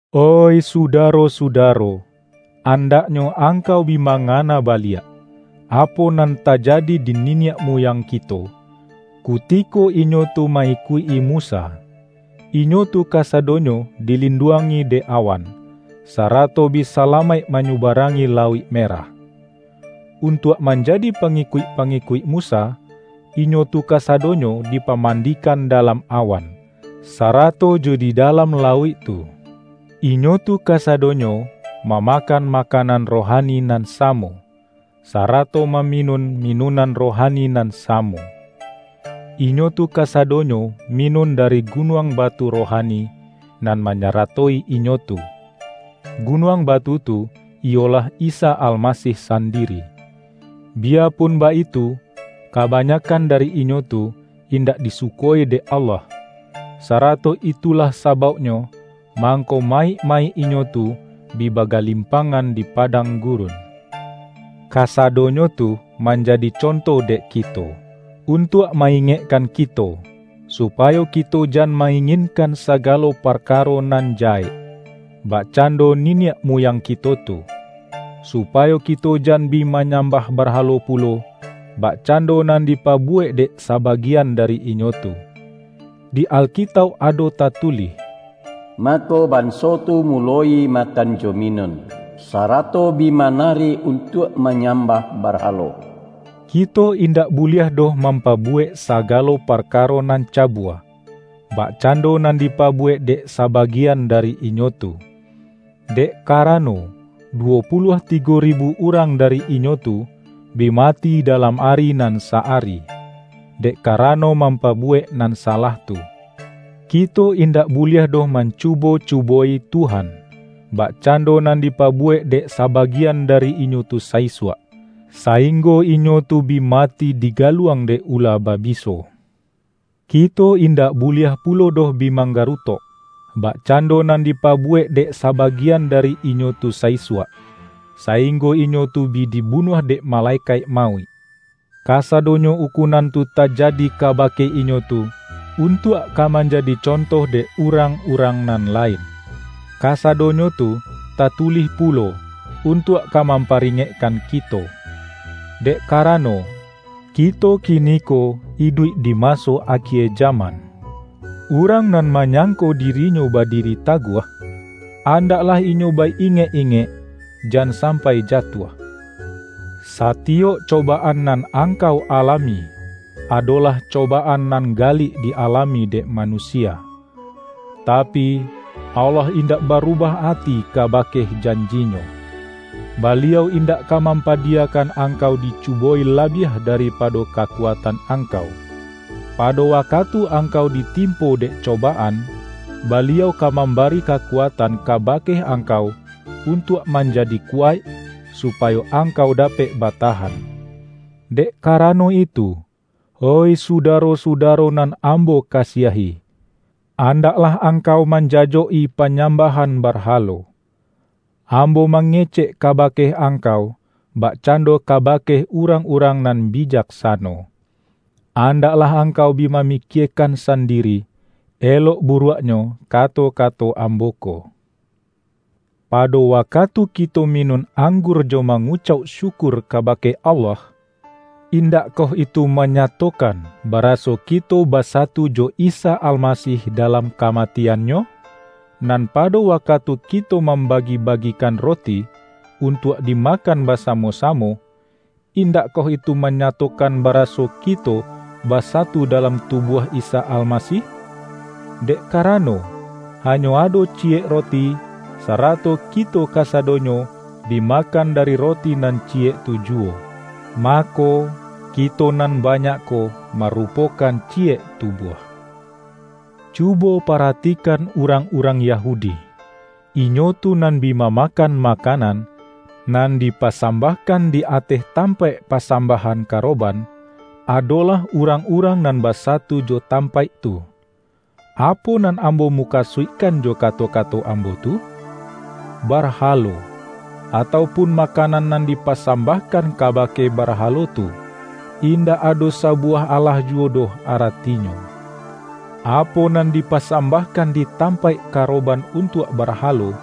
Oih sudaro-sudaro! Andaknyo angkau bi mangana baliak, apo nan tajadi di niniak muyang kito, ku-tiko inyo tu ma-ikuik-i Musa. Inyo tu kasadonyo dilinduangi dek awan, sa-rato bi salamaik manyubarangi Lauik Merah. Untuak manjadi pangikuik-pangikuik Musa, inyo tu kasadonyo di-pamandikan dalam awan, sarato jo di dalam lauik tu. Inyo tu kasadonyo, mamakan makanan rohani nan samo, sarato maminun, minunan rohani nan samo. Inyo tu kasadonyo minun da-ri gunuang batu rohani, nan manya-ratoi inyo tu; gunuang batu tu iyolah Isa Almasih sandiri. Biyapun baitu, kabanyakkan dari inyo tu indak disu-ko-i dek Allah, sarato itulah sabauk-nyo mangko mayik-mayik inyo tu bi bagalimpangan di padang gurun. Kasadonyo tu manjadi conto dek ki-to, untuak ma-ingekkan kito, supayo kito jan ma-inginkan sagalo parkaro nan jahek, bakcando niniak muyang kito tu. Supayo kito jan bi manyam-bah barhalo pulo, bakcando nan dipabuwek dek sabagian dari inyo tu. Di Alkitauk ado tatulih,”Mako, ban-so tu muloi makan jo minun, sarato bi manari untuak manyambah barhalo.” Kito indak buliah doh mampabuwek sagalo parkaro nan cabua, bakcando nan dipabuwek dek sabagian dari inyo tu. Dek karano, duwo puluah tigo ribu urang dari inyo tu, bi mati dalam ari nan sa-ari, dek karano mampabuwek nan salah tu. Kito indak buliah doh mancubo-cuboi Tuhan, bakcando nan dipabuwek dek sabagian dari inyo tu sa-isuak, sainggo inyo tu bi mati diga-luang dek ula babiso. Kito indak bu-liah pulo doh bi manggarutok; bakcan-do nan dipabuwek dek sabagian dari inyo tu sa-isuak, sainggo inyo tu bi di-bunuah dek Malekaik Mauik. Kasadonyo ukunan tu tajadi kaba-ke inyo tu, untuak ka manjadi conto dek urang-urang nan lain. Kasadonyo tu tatulih pulo, untuak ka mampari-ngekkan kito. Dek karano, kito kini-ko iduik di maso akie jaman. Urang nan manyangko dirinyo ba-diri taguah, andaklah inyo ba-ingek-ingek; jan sampai jatuah. Satiyok cobaan nan angkau alami, adolah co-baan nan galik di-alami dek manusia. Tapi, Allah indak barubah ati kaba-ke janji-Nyo. Baliau indak ka mampa-diyakan angkau dicuboi labiah dari-pado kakuatan angkau. Pado wakatu angkau ditimpo dek cobaan, Baliau ka mambari kakuatan kabake angkau un-tuak manjadi kuwaik, supayo angkau dapek batahan. Dek karano itu, oih sudaro-suda-ro nan ambo kasiahi, andaklah ang-kau manjajok-i panyambahan barha-lo. Ambo mangecek kabake angkau bakcando kabake urang-urang nan bi-jaksano. Andaklah angkau bi mamikie-kan sandiri, elok buruaknyo kato-kato ambo ko. Pado wakatu kito minun anggur jo mangucauk syukur kabake Allah, indakkoh itu manyatokan ba-raso kito basatu jo Isa Almasih dalam kamatian-Nyo? Nan pado wakatu ki-to mambagi-bagikan roti, untuak di-makan basamo-samo, indakkoh itu manyatokan baraso kito basatu da-lam tubuah Isa Almasih? Dek ka-rano, hanyo ado ciyek roti, sarato ki-to kasadonyo bi makan dari roti nan ciyek tu juwo, mako, kito nan banyak ko marupokan ciyek tubuah. Cubo paratikan urang-urang Ya-hudi. Inyo tu nan bi mamakan ma-kanan, nan dipasambahkan di ateh tampaik pasambahan karoban, ado-lah urang-urang nan basatu jo tam-paik tu. Apo nan ambo mukasuik-kan jo kato-kato ambo tu? Barhalo, atau pun makanan nan dipasambah-kan kabake barhalo tu, indak ado sa-buwah alah juwo doh aratinyo. Apo nan dipasambahkan di tampaik karo-ban untuak barhalo,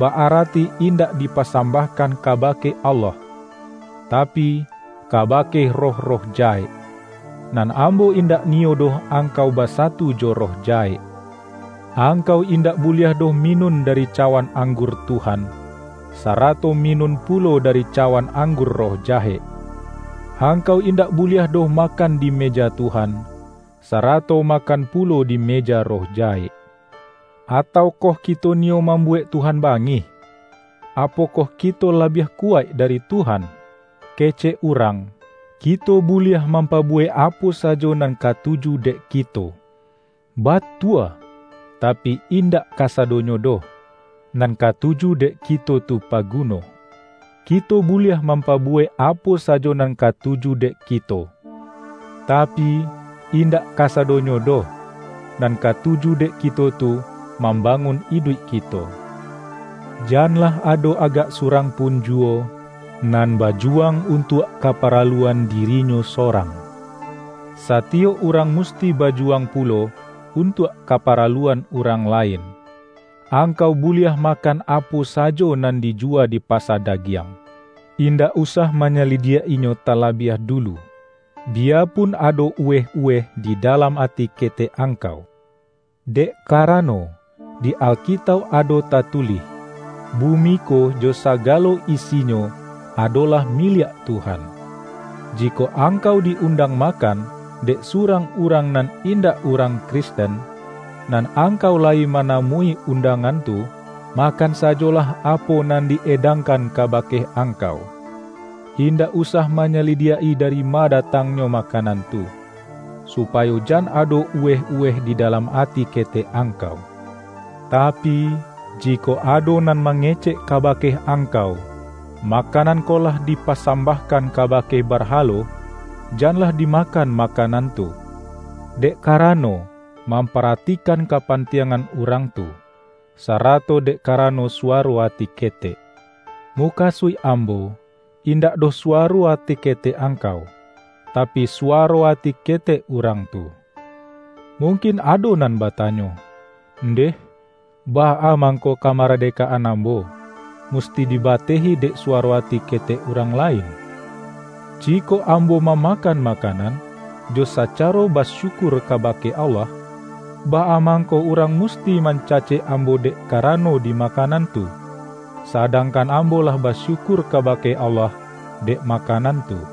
ba-arati indak di-pasambahkan kabake Allah, tapi, ka-bake roh-roh jahek. Nan ambo indak niyo doh angkau basatu jo roh jahek. Angkau indak buliah doh minun dari cawan anggur Tuhan, sarato mi-nun pulo dari cawan anggur roh ja-hek. Angkau indak buliah doh makan di meja Tuhan, sarato makan pulo di meja roh jahek. Ataukoh kito niyo mambuwek Tuhan bangih? Apokoh ki-to labiah kuwaik dari Tuhan? Kecek urang,”Kito buliah mam-pabuwek apo sajo nan katuju dek ki-to.” Batua! Tapi indak kasadonyo doh, nan katuju dek kito tu paguno.”Kito buliah mampabuwek apo sajo nan ka-tuju dek kito”- tapi, indak kasadonyo doh, nan katuju dek kito tu, mamba-ngun iduik kito. Janlah ado agak surang pun juwo, nan bajuwang un-tuak kaparaluan dirinyo sorang. Sa-tiyok urang musti bajuwang pulo, un-tuak kaparaluan urang lain. Angkau buliah makan apo sajo nan dijuwa di pasa dagiang. Indak usah manyalidiak-inyo talabiah dulu, biya-pun ado uweh-uweh di dalam ati ke-tek angkau. Dek karano, di Alkitauk ado tatulih,”Bumi ko jo sagalo isinyo, adolah miliak Tuhan.” Jikok angkau di-undang makan, dek surang urang nan indak urang Kristen, nan angkau layi manamui un-dangan tu, makan sajolah apo nan di-edangkan kabake angkau. Indak usah manyalidiak-i dari ma datangnyo ma-kanan tu, supayo jan ado uweh-uweh di dalam ati ketek angkau. Tapi, ji-kok ado nan mangecek kabake ang-kau,”Makanan ko lah dipasambah-kan kabake barhalo,” janlah dimakan makanan tu, dek karano mampara-tikan kapantiangan urang tu, sarato dek karano suwaro ati ketek. Mu-kasuik ambo, indak doh suwaro ati ketek angkau, tapi, suwaro ati ketek urang tu. Mungkin ado nan batanyo,”Ndeh, baa mangko kamaradekaan ambo, musti dibatehi dek suwaro ati ketek urang lain? Jikok ambo mamakan makanan, jo sacaro basyukur kabake Allah, baa mangko urang musti man-cacek ambo dek karano di makanan tu, sadangkan ambo lah basyukur ka-bake Allah dek makanan tu?"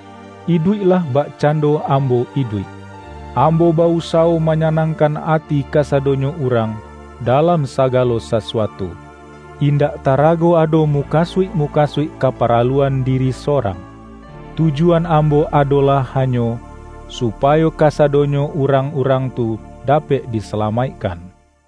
Iduiklah bakcando ambo iduik. Ambo ba-usawo manyanangkan ati kasadonyo urang dalam sagalo sasuatu, indak tarago ado mukasuik-mukasuik kaparaluan diri sorang. Tujuan ambo adolah ha nyo, supayo kasadonyo urang-urang tu dapek disalamaikkan.